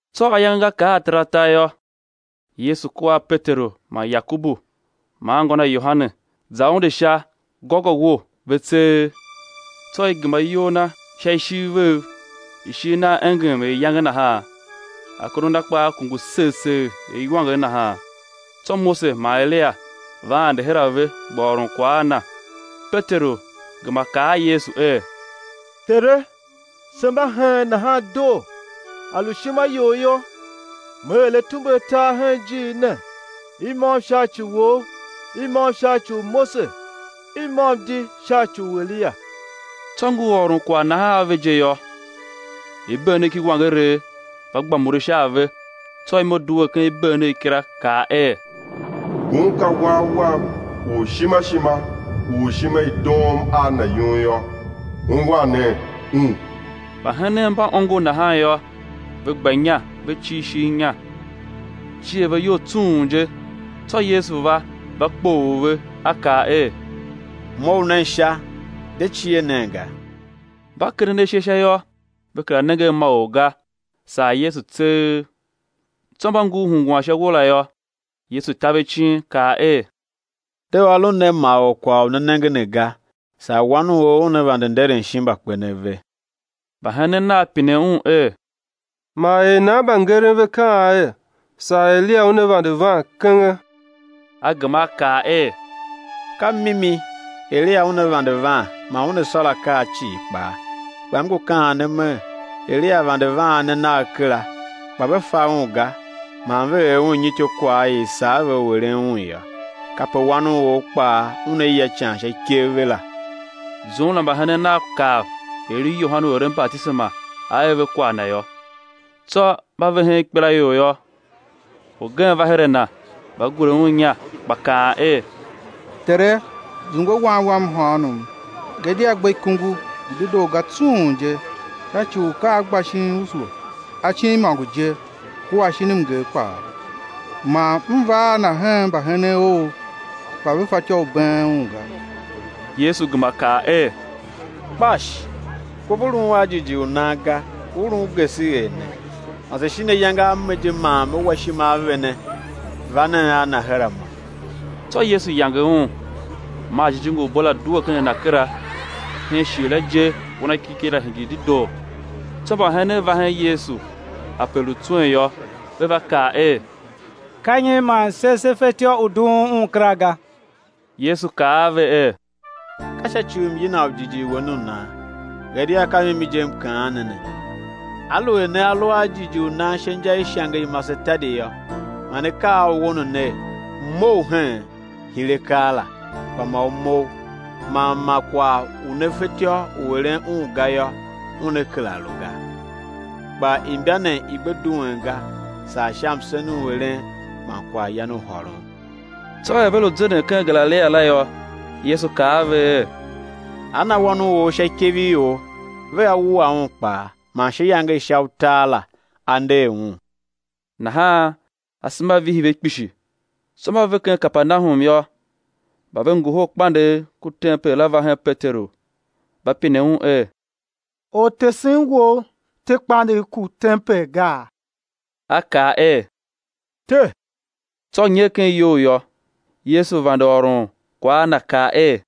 Tsô ayange nga kar ataratar yô, Yesu kua a Peteru man Yakobu man anngô na Yohane, za unde sha gôgôwo, ve tseegh; tsô i gema iyol Na sha ishiv vev; ishigh Nagh engem er iyange nahan, akondo Na kpaa kungu segh segh er iwanger nahan. Tsô Mose man Eliya va ande her a ve gba ôron kwagh a Na. Peteru gema kaa a Yesu er: Tere, se mba heen nahan doo; a lu ishima You yô, me er atumbe atar hen ijiir ne, i môm sha ci u Wou, i môm sha ci u Mose, i môm di sha ci u Eliya. Tsô ngur ôron kwagh nahan ave je yô, ibeenegh ki iwangeregh va gba mure sha a ve; tsô imo due ken ibeenegh kila, kaa er: Ngun ka Wan Wam u ishima ishima, u ishima i doom a Na yum yô, ungwan nen Un. Mbahenen mba ongo nahan yô, ve gba inya ve cir ishigh inya, cier ve iyol tsung je. Tsô Yesu va, va kpoghol ve, A kaa er: Mough nen sha, de cie nen ga. Mba kenden ashe sha yô, ve kera nenge a ma or ga, saa Yesu tseegh. Tsô mba ngur hungwan sha uwo la yô, Yesu ta ve icin, kaa er: De ôron nen ma or kwagh u ne nenge ne ga, saa Wan u or Una vande nderen shin mbakpenev ve. Mbahenen Nav pine Un er: Man er nan mbangeren ve kaan er: Saa Eliya una vande van kenge? A gema A kaa er: Ka mimi, Eliya una vande van man una sôr akaa cii kpaa. Kpa M ngu kaan ne mer, Eliya vande van a ne nagh kera, kpa ve fa un ga man ve er un nyi ityôkwagh i i sar ve u eren un yô. Kape Wan u or kpaa Una ya ican sha ikev ve la. Zum la mbahenen Nav kav er i lu Yohane u eren batisema A er ve kwagh na yô. Tsô mba ve hen ikpelaior yô, orgen va her a Na, va gure Un inya, gba kaan er: Tere, zungwe wan wam mhôônom, gadia gbe ikungu, ngu dedoo ga tsung je, sha ci u ka a gba shin usu acin imôngo je kua shin mnger kpaa. Man m va a na hen mbahenen Ou kpa ve fatyô u been un ga. Yesu gema kaa er: Kpash! Kov u lun a jighjigh u nan ga, u lun geseghee ne, mase shin ayange a me je man Me wa ishima a vene? Va nen a na her a Mo. Tsô Yesu yange un, maa jijingi u bo la due ken a na kera; hen shighe la je wanakiriki la hingir dedoo. Tsô mbahenen va hen Yesu ape lu tswen yô, ve va kaa er: Ka nyi man se se fetyô u dughun un kera ga? Yesu kaa a ve er: Ka sha ci u myina u jighjigh wen u nan; gadia ka mimi je M kaan ne ne, aluer nea lu a jighjigh u nan sha inja i ishange i masetadi yô, ma ne kaa a uwo ne ner: Mough heen, hire keela, kpa ma u mough; man ma kwagh u ne fatyô u eren un ga yô, una kera lu ga. [Kpa imba ne i gbe duen ga saa sha msen u eren man kwaghyan u hôron] Tsô er ve lu zenden ken Galilia la yô, Yesu kaa a ve er: Á na Wan u or sha ikev i ior. Vea wua Un kpaa, man sha iyange i sha utar la á nder Un. Nahan asema vihi ve kpishi. Tsô mba ve ken Kapernahum yô, mba ve ngohol kpandegh ku tempel la va hen Peteru, va pine un er: Ortesen wou te kpandegh ku tempel gaa? A kaa er: Te! Tsô nyer ken iyou yô, Yesu vande ôron kwagh a na, kaa er: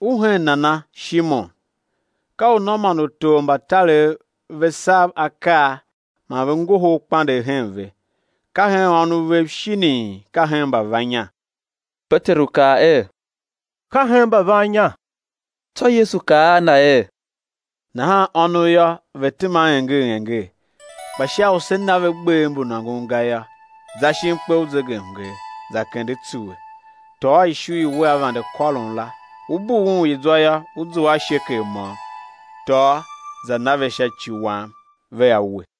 U hen nana, Shimon? Ka unô man utor mba tarev ve sav akaa man ve ngohol kpandegh hen ve, ka hen ônov vev shinii, ka hen mbavannya. Peteru kaa er: Ka hen mbavannya. Tsô Yesu kaa a na er: Nahan ônov yô, ve tema enger enger. Kpa sha u se na ve gbev mbu nôngon ga yô, za shin kpe u zegemnger, za kende tsuwe, tôô ishu i wea vande kôron la; ú bughun i zwa yô, ú zua a shekel môm; tôô, za na ve sha ci Wam vea we.